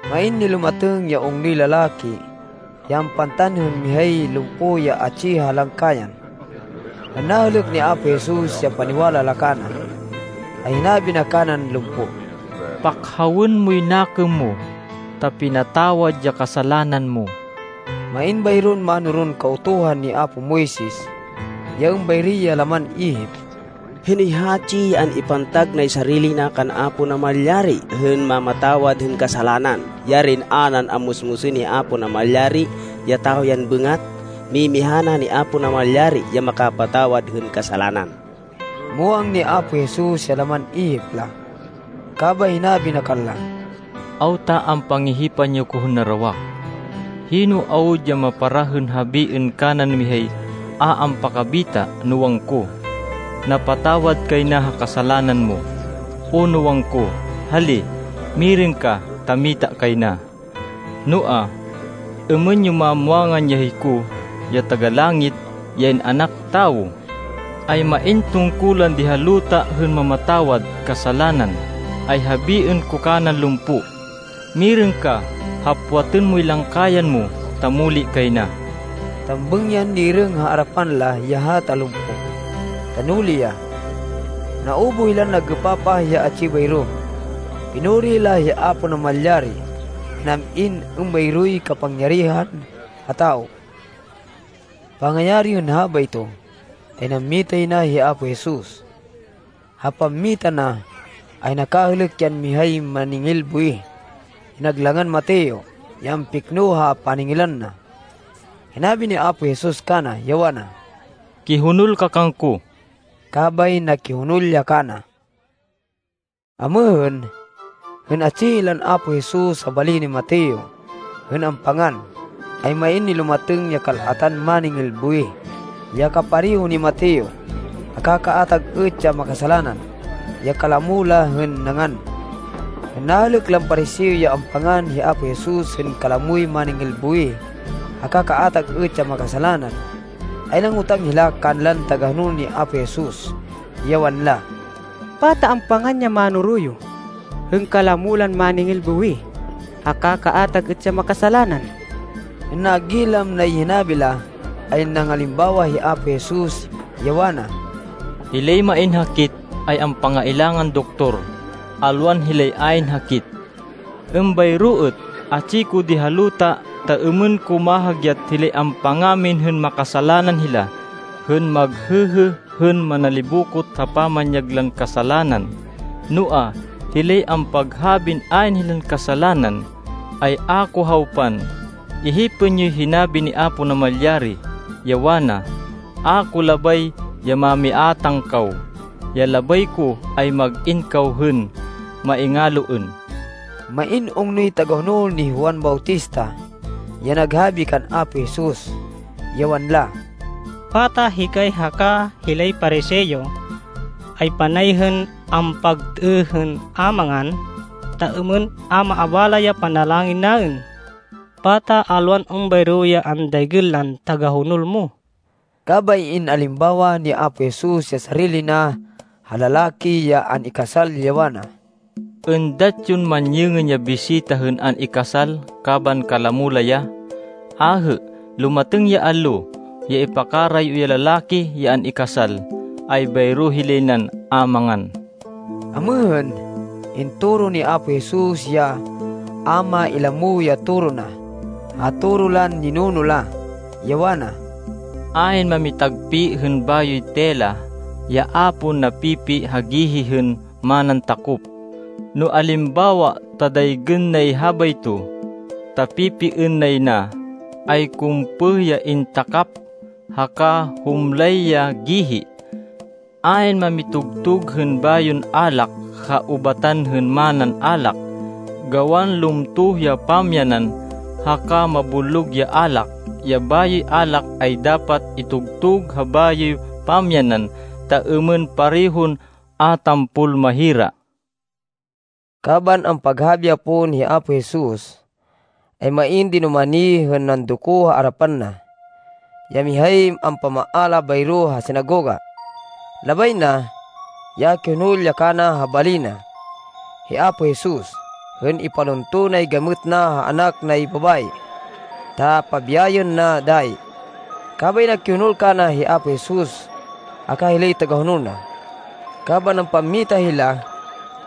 Main nilumatêng ya ungnoy lalaki ya ampantan hên mihay lumpo ya atsi ha langkayan. Hên nahêlêk ni Apo Jesus ya paniwala la kana, ay hinabi na kanan lumpo, “Pakhawên moy nakêm mo, ta pinatawad ya kasalanan mo.” Main bayron mánoron Kautuhan ni apo Moises ya êmbayri ya laman ihip, “Hinoy hatsi ya an-ipantag nay sarili na kan Apo Namalyari hên mamatawad hên kasalanan? Yarin a nan ammusmusên hi Apo Namalyari ya tawo yan bêngat! Mimiha na ni Apo Namalyari ya makapatawad hên kasalanan.” Muwang ni Apo Jesus ya laman ihip la. Kabay hinabi na kanla, “Awta ampangihipan yo ko hên narawak? Hino awud ya maparah hên habiên kanan mihay a ampakabita, no wangko, ‘Napatawad kay na ha kasalanan mo,’ o no wangko, ‘Hali, mirêng ka ta mita kay na?’ Noa, êmên yo mamwangan ya hiko, ya Taga-Langit, ya In-anak Tawo, ay main tungkulan di ha luta hên mamatawad kasalanan, ay habiên ko kanan lumpo, ‘Mirêng ka. Hapwatên moy langkayan mo ta muli kay na.’” Tambêng yan nirêng ha arapan la ya hata lumpo, ta nuli ya. Naubuh hilan nag-êpapah ya atsi bayro. Pinuri la hi Apo Namalyari, ya nam-in êmbayroy kapangyarihan ha tawo. Pangayari hên habayto, ay nammita yay na hi Apo Jesus. Ha pammita na, ay nakahêlêk yan mihay máningil buwih ya nag langan Mateo, ya ampikno ha paningilan na. Hinabi ni Apo Jesus kana, ya wana, “Kihonol ka kangko.” Kabay nakihonol ya kana. Amêhên, hên atsi hilan Apo Jesus ha bali ni Mateo hên ampangan, ay main nilumatêng ya kal-atan máningil buwih, ya kapareho ni Mateo, haka kaatag êt ya makasalanan, ya kalamo la hên nangan. Hên nahêlêk lan Pariseo ya ampangan hi Apo Jesus hên kalamoy máningil buwih, haka kaatag êt ya makasalanan, ay nangotang hila kanlan tagahonol ni Apo Jesus, ya wanla, “Pata ampangan ya mánoro yo, hên kalamo lan máningil buwih, haka kaatag êt ya makasalanan?” Hên nagilam nay hinabi la, ay nangalimbawa hi Apo Jesus, ya wana, “Hilay main hakit, ay ampangailangan doktor, alwan hilay ayn hakit. Êmbayro êt, atsi ko di ha luta ta êmên ko mahagyat hilay ampangamin hên makasalanan hila, hên maghêhê hên manalibokot ha pamanyag lan kasalanan. Noa, hilay ampaghabin ayn hilan kasalanan, ay a ko hawpan. Ihipên yoy hinabi ni Apo Namalyari, ya wana, ‘A ko labay ya mamiátang kaw. Ya labay ko ay mag-in kaw hên maingaloên.’” Main ungnoy tagahonol ni Juan Bautista ya naghabi kan Apo Jesus, ya wanla, “Pata hikay haka hilay Pariseo, ay panay hên ampagtêêh hên a mangan, ta êmên a maabala ya panalangin naên? Pata alwan êmbayro ya andaygên lan tagahonol mo?” Kabay in-alimbawa ni Apo Jesus ya sarili na ha lalaki ya an-ikasal, ya wana, “Êndat yon manyêngên ya bisita hên an-ikasal kaban kalamo la ya? Ahê! Lumatêng ya allo ya ipakarayo ya lalaki ya an-ikasal, ay bayro hilay nan a mangan.” Amêhên, intoro ni Apo Jesus ya a mailamo ya toro na, ha toro lan ninuno la, ya wana, “Ayn mamitagpi hên bayoy tela, ya a pon napipi ha gihi hên manan takop. No alimbawa ta daygên nay habayto, ta pipiên nay na, ay kumpêh ya intakap, haka humlay ya gihi. Ayn mamitugtug hên bayon alak ha ubatan hên manan alak, gawan lumtoh ya pamyanan, haka mabullog ya alak. Ya bayoy alak ay dapat itugtug ha bayoy pamyanan, ta êmên parehon a tampol mahira.” Kaban ampaghabi ya pon hi Apo Jesus, ay main dinumani hên nandoko ha arapan na, ya mihay ampamaala bayro ha sinagoga. Labay na, ya kihonol ya kana ha bali na, hi Apo Jesus, hên ipalunto nay gamêt na ha anak nay babayi, ta pabiyayên na dayi. Kabay nakihonol kana hi Apo Jesus haka hilay tagahonol na. Kaban ampammita hila,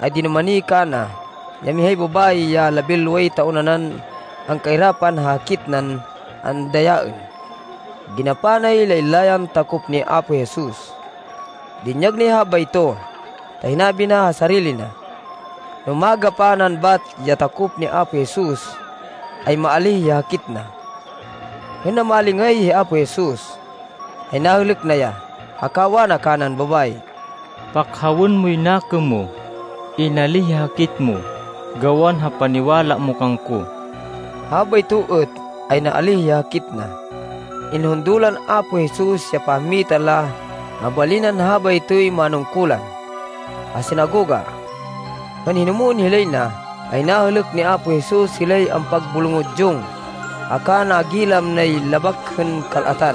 ay dinumani kana, ya mihay babayi ya labinloway taon nanan angkairapan ha hakit nan andayaên. Ginapa nay laylayan takop ni Apo Jesus. Dinyag nay habayto, ta hinabi na ha sarili na, no magapa nan bat ya takop ni Apo Jesus, ay maalíh ya hakit na. Hên namalingay hi Apo Jesus, ay nahêlêk na ya, haka wana kanan babayi, “Pakhawên moy nakêm mo. Inalíh ya hakit mo, gawan ha paniwala mo kangko.” Habayto êt, ay naalíh ya hakit na. Inhundo lan Apo Jesus ya pammita la ha bali nan habaytoy manungkulan, ha sinagoga. Hên hinumwên hilay na, ay nahêlêk ni Apo Jesus hilay ampag-bulongudyong, haka nagilam nay labak hên kal-atan.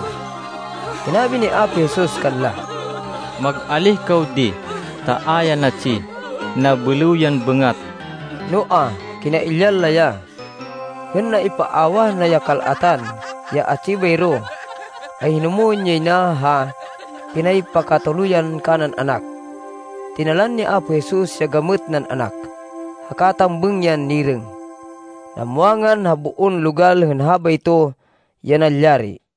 Hinabi ni Apo Jesus kanla, “Mag-alíh kaw di, ta a ya natsi. Nabêlêw yan bêngat.” Noa, kinailyan la ya. Hên naipaawah na ya kal-atan ya atsi bayro, ay hinumwên yay na ha pinaypakatuluyan kanan anak. Tinalan ni Apo Jesus ya gamêt nan anak, haka tambêng yan nirêng. Namwangan ha boon logal hên habayto ya nalyari.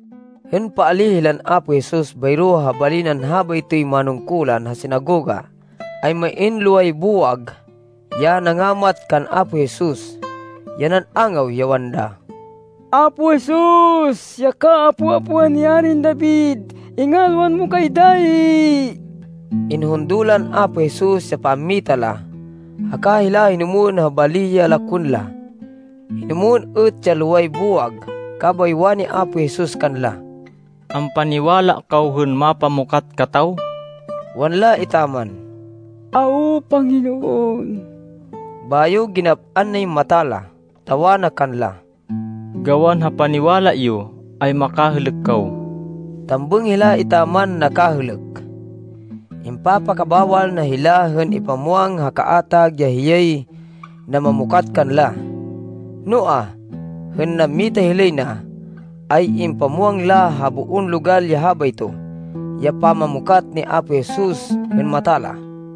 Hên paalíh hilan Apo Jesus bayro ha bali nan habaytoy manungkulan ha sinagoga, ay main loway buwag, ya nangamat kan Apo Jesus, ya nan-angaw, ya wanla, “Apo Jesus, ya kaapo-apoan ni Arin David, ingalwan mo kay dayi!” Inhundo lan Apo Jesus ya pammita la, haka hila hinumwên ha bali ya lakwên la. Hinumwên êt ya loway buwag, kabay wani Apo Jesus kanla, “Ampaniwala kaw hên mapamukat kataw?” Wanla etaman, “Awo, Panginoon.” Bayo ginap-an nay mata la, ta wana kanla, “Gawan ha paniwala yo, ay makahêlêk kaw.” Tambêng hila etaman nakahêlêk. Impapakabawal na hila hên ipamwang ha kaatag ya hiyay namamukat kanla. Noa, hên nammita hilay na, ay impamwang la ha boon logal ya habayto, ya pamamukat ni Apo Jesus hên mata la.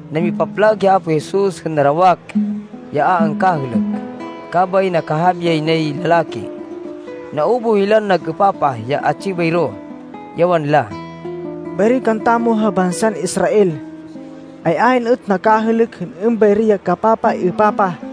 Namipaplag hi Apo Jesus hên narawak ya a angkahêlêk, kabay nakahabi yay nay lalaki. Naubuh hilan nag-êpapah ya atsi bayro, ya wanla, “Bayri kantamo ha bansan Israel, ay ayn êt nakahêlêk hên êmbayri ya kapapaêpapah.”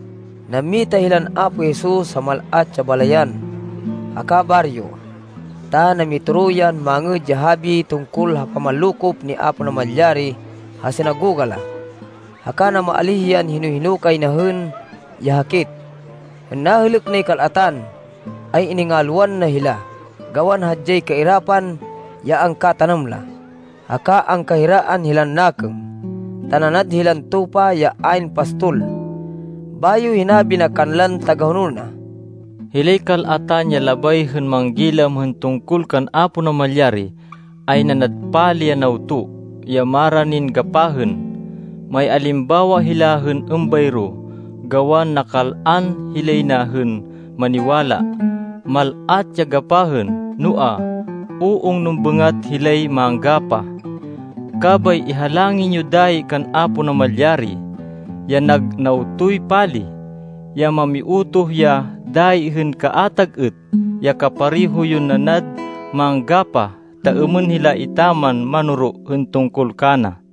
Nammita hilan Apo Jesus ha mal-at ya balayan haka baryo, ta namitoro yan Mangêd ya Habi tungkol ha pamanlokop ni Apo Namalyari ha sinagoga la, haka namaalíh yan hino-hino kay na hên ya hakit. Hên nahêlêk nay kal-atan, ay iningalwan na hila, gawan hadyay kairapan ya angkatanam la, haka angkahiraan hilan nakêm, ta nanad hilan tupa ya ayn pastol. Bayo hinabi na kanlan tagahonol na, “Hilay kal-atan ya labay hên manggilam hên tungkol kan Apo Namalyari, ay nanad pali ya nawto, ya maranin gapahên. Maialimbawa hila hên êmbayro gawan nakal-an hilay na hên maniwala. Mal-at ya gapahên, noa, u-ungnon bêngat hilay manggapah. Kabay ihalangin yo dayi kan Apo Namalyari, ya nag nawtoy pali, ya mamiutoh ya dayi hên kaatag êt, ya kapareho yon nanad manggapah, ta êmên hila etaman manoro hên tungkol kana.”